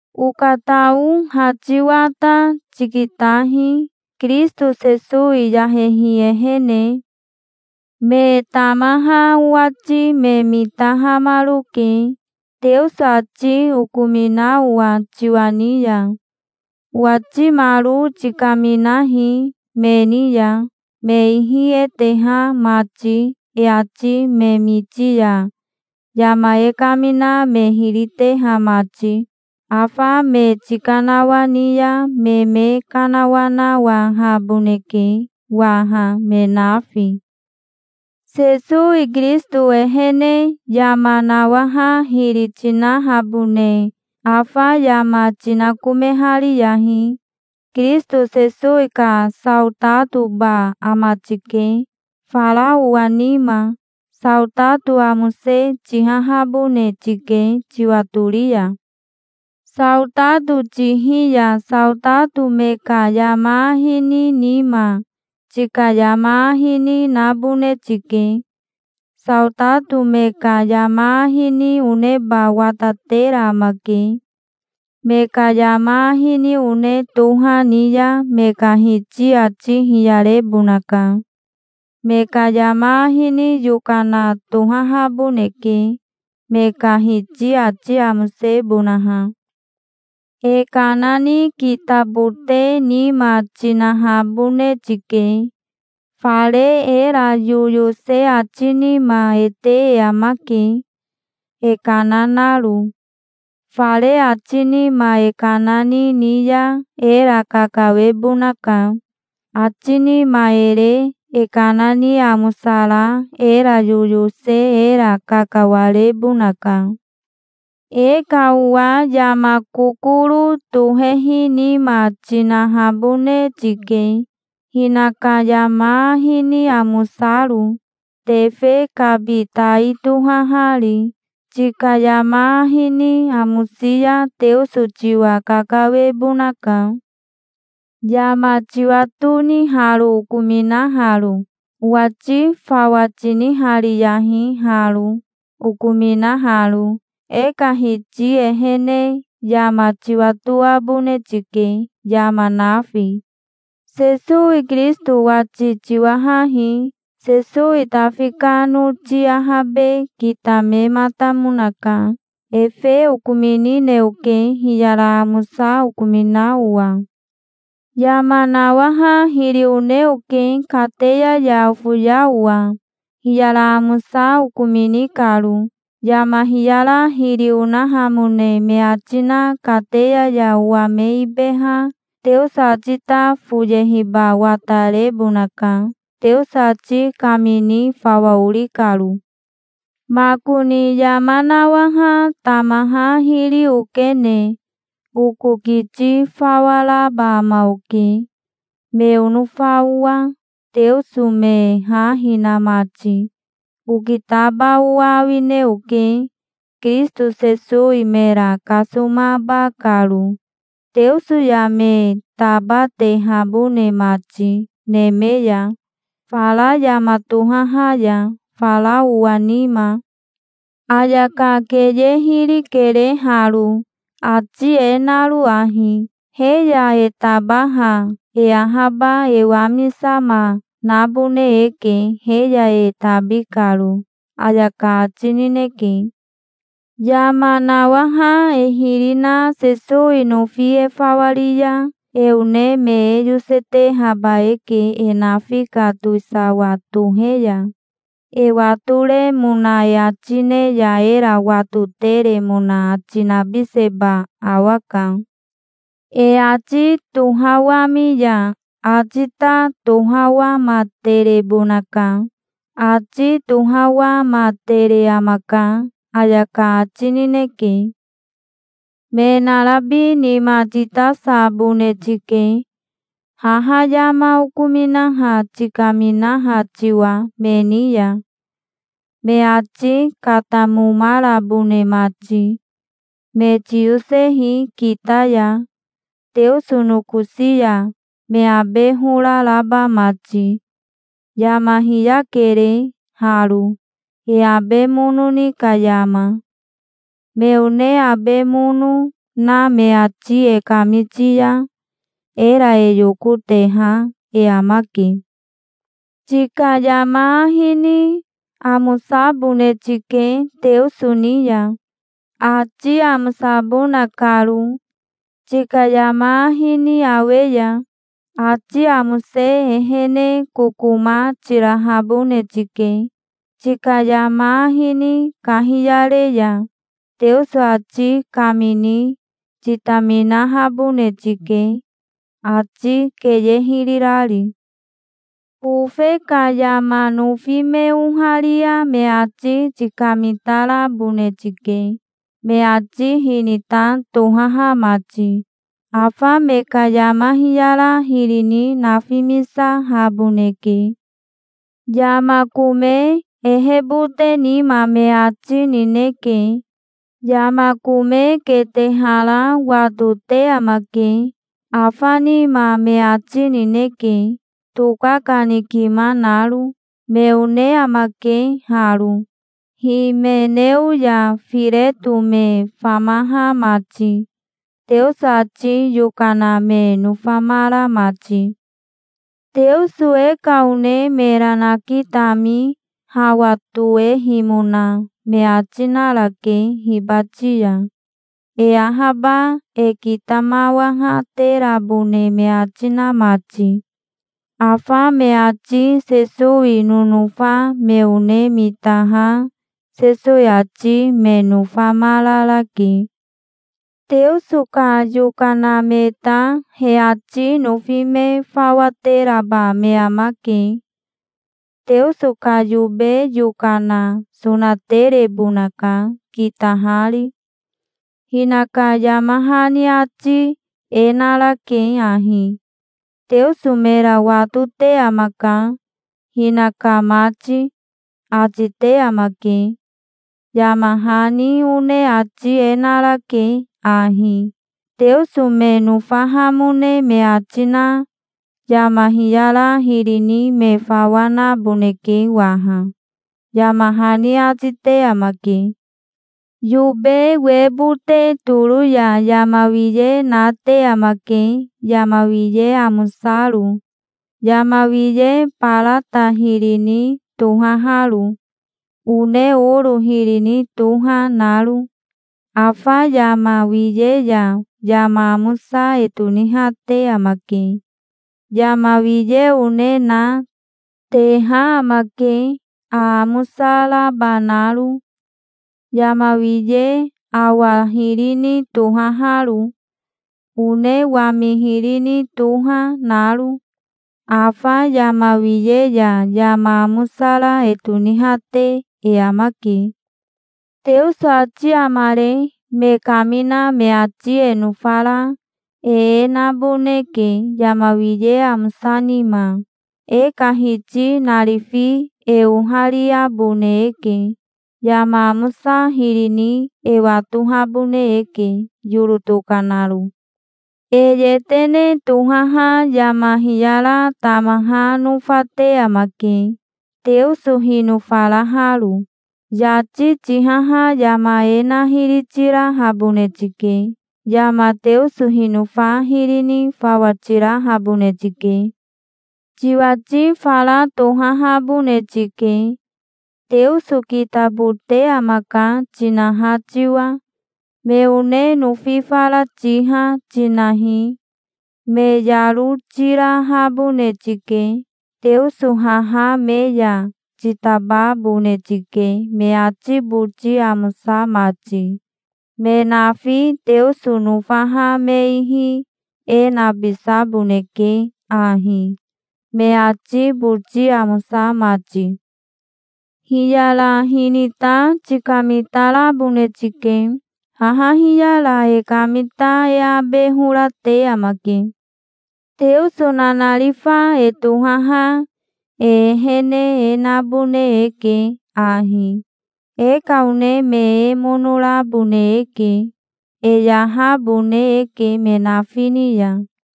Okatao ha tiwa ta tikitahi, Kirisito Sesowi yahehi ehene. Me tamaha owati me mitahamaroke, Teoso ati okomina owa tiwa ni ya. Owatimaro tikaminahi me ni ya, me ihi e teha mati, e ati me miti ya yama e kamina me hiri teha mati. Afa me tikanawani ya me me kanawanawahaboneke waha me nafi. Sesowi Kirisito ehene yama nawaha hiri tinahabone afa yama tinakomehariyahi. Kirisito Sesowi ka saotatoba ama tike, fara owa nima. Saotato amose tihahabone tike tiwatori ya. Saotato tihi ya saotato me ka yama ahi ni nima, tika yama ahi ni, nabone tike. Saotato me ka yama ahi ni oneba watatera amake. Me ka yama ahi ni one toha ni ya me ka hiti ati hiyarebonaka. Me ka yama ahi ni yokana tohahaboneke, me ka hiti ati amosebonaha. E kana ni kitabote nima tinahabone tike. Fare era yoyose ati nima e te e amake, e kana naro. Fare ati nima e kana ni ni ya era kakawebonaka. Ati nima e re e kana ni amosara era yoyose era kakawarebonaka. E ka owa yama kokoro tohehi nima tinahabone tike, hinaka yama ahi ni amosaro, tefe kabi tai tohahari. Tika yama ahi ni amosi ya Teoso tiwa kakawebonaka. Yama tiwatoni haro okominaharo? Owati fawa tinihariyahi haro, okominaharo. E ka Hiti ehene yama tiwatoabone tike, yama nafi. Sesowi Kirisito wati tiwahahi. Sesowi Tafi ka noti ahabe kitamematamonaka. Efe okominine oke, hiyara amosa okomina owa. Yama nawaha hiri one oke, kateya ya ofoya owa, hiyara amosa okomini karo. Yama hiyara hiri onahamone me ati na kateya ya owa me ibeha Teoso ati ta foyehiba watarebonaka, Teoso ati kamini fawa ori karo. Makoni yama nawaha tamaha hiri okene oko kiti fawa raba ama oke, me onofa owa, Teoso me ha hina mati. Okitaba owa awine oke, Kirisito Sesowi mera kasomaba karo, Teoso ya me tabatehabone mati, neme ya fara yama tohaha ya, fara owa nima. Ayaka keye hiri kere haro, ati e naro ahi: "He ya e tabaha e ahaba e wamisama nabone eke he ya e tabi karo", ayaka ati nineke. "Yama nawaha e hiri na Sesowi nofi e fawa ri ya e one me e yosetehaba eke e nafi ka towisawa tohe ya. E watoremona e ati ne ya era watoteremona ati nabiseba awaka. E ati tohawami ya ati ta tohawamaterebonaka. Ati tohawamatere amaka", ayaka ati nineke. Me narabi nima titasabone tike, haha yama okominaha tikaminaha tiwa me ni ya, me ati katamomarabone mati. Me tiyosehi kita ya Teoso nokosi ya, me abe hora raba mati. Yama hiyakere haro, e abe mono ni ka yama. Me one abe mono na me ati e kamiti ya era e yokoteha e amake. Tika yama ahi ni amosabone tike Teoso ni ya, ati amosabona karo, tika yama ahi ni awe ya. Ati amose ehene kokoma tirahabone tike, tika yama ahi ni kahiyare ya. Teoso ati kamini titaminahabone tike, ati keye hiri rari. Bofe ka yama nofi me oharia me ati tikamitarabone tike, me ati hinita tohaha mati. Afa me ka yama hiyara hiri ni nafimisahaboneke. Yama kome ehebote nima me ati nineke. Yama kome ketehara wa tote amake. Afa nima me ati nineke, tokakanikima naro. Me one amake haro, Himeneo ya Fireto me famaha mati, Teoso ati yokana me nofamara mati. Teoso e ka one mera nakitami hawa toehimona me ati narake hibati ya, e ahaba e kitamawahaterabone me ati na mati. Afa me ati Sesowi nonofa me one mitaha Sesowi ati me nofamararake. Teoso ka yokana me ta he ati nofi me fawa teraba me amake. Teoso ka yobe yokana sonaterebonaka, kitahari. Hinaka yama hani ati e narake ahi: "Teoso mera watote amaka, hinaka mati", ati te amake. Yama hani one ati e narake ahi: "Teoso me nofahamone me ati na yama hiyara hiri ni me fawa naboneke waha", yama hani ati te amake. Yobe webote toro ya yama wiye nate amake yama wiye amosaro, yama wiye barata hiri ni tohaharo, one oro hiri ni toha, naro. Afa yama wiye ya yama amosa e tonihate amake. Yama wiye one na, teha amake aamosa raba naro, yama wiye awa hiri ni tohaharo, one wami hiri ni toha, naro. Afa yama wiye ya yama amosara e tonihate e amake. Teoso ati amare me kamina me ati e nofara e e naboneke yama wiye amosa nima. E ka Hiti narifi e ohariabone eke. Yama amosa hiri ni e watohabone eke, yoro tokanaro. E yetene tohaha yama hiyara tamaha nofate amake, Teoso hinofaraharo. Yati tihaha yama e na hiri tirahabone tike. Yama Teoso hinofa hiri ni fawa tirahabone tike. Tiwati fara tohahabone tike, "Teoso kitabote amaka", tinaha tiwa. Me one nofi fara tiha, tinahi. Me yaro tirahabone tike. Teoso haha me ya titababone tike, me ati boti amosa mati. Me nafi Teoso nofaha me ihi e nabisaboneke ahi, me ati boti amosa mati. Hiyara hinita tikamitarabone tike. Haha hiyara e kamita e abe hora te amake. Teoso nanarifa e tohaha e ehene e nabone eke ahi. E ka one me e mono rabone eke. E yahabone eke me nafi ni ya.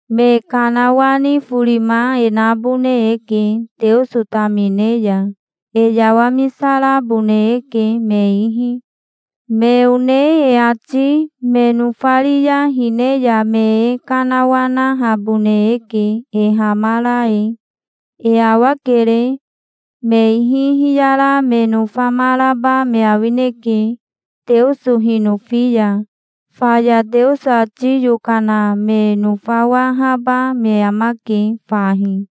Me kanawani forima e nabone eke Teoso tamine ya. E yawamisarabone eke me ihi. Me one e ati me nofari ya hine ya me e kanawanahabone eke e hamara e. E awakere. Me ihi hiyara me nofamaraba me awineke, Teoso hinofi ya. Faya Teoso ati yokana me nofawahaba me amake fahi.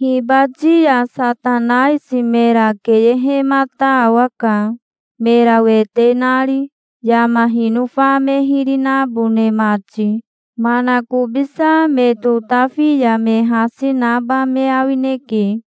Hibati ya Satanaisi mera keyehemata awaka, mera wete nari, yama hinofa me hiri nabone mati. Manakobisa me totafi ya me hasi naba me awineke.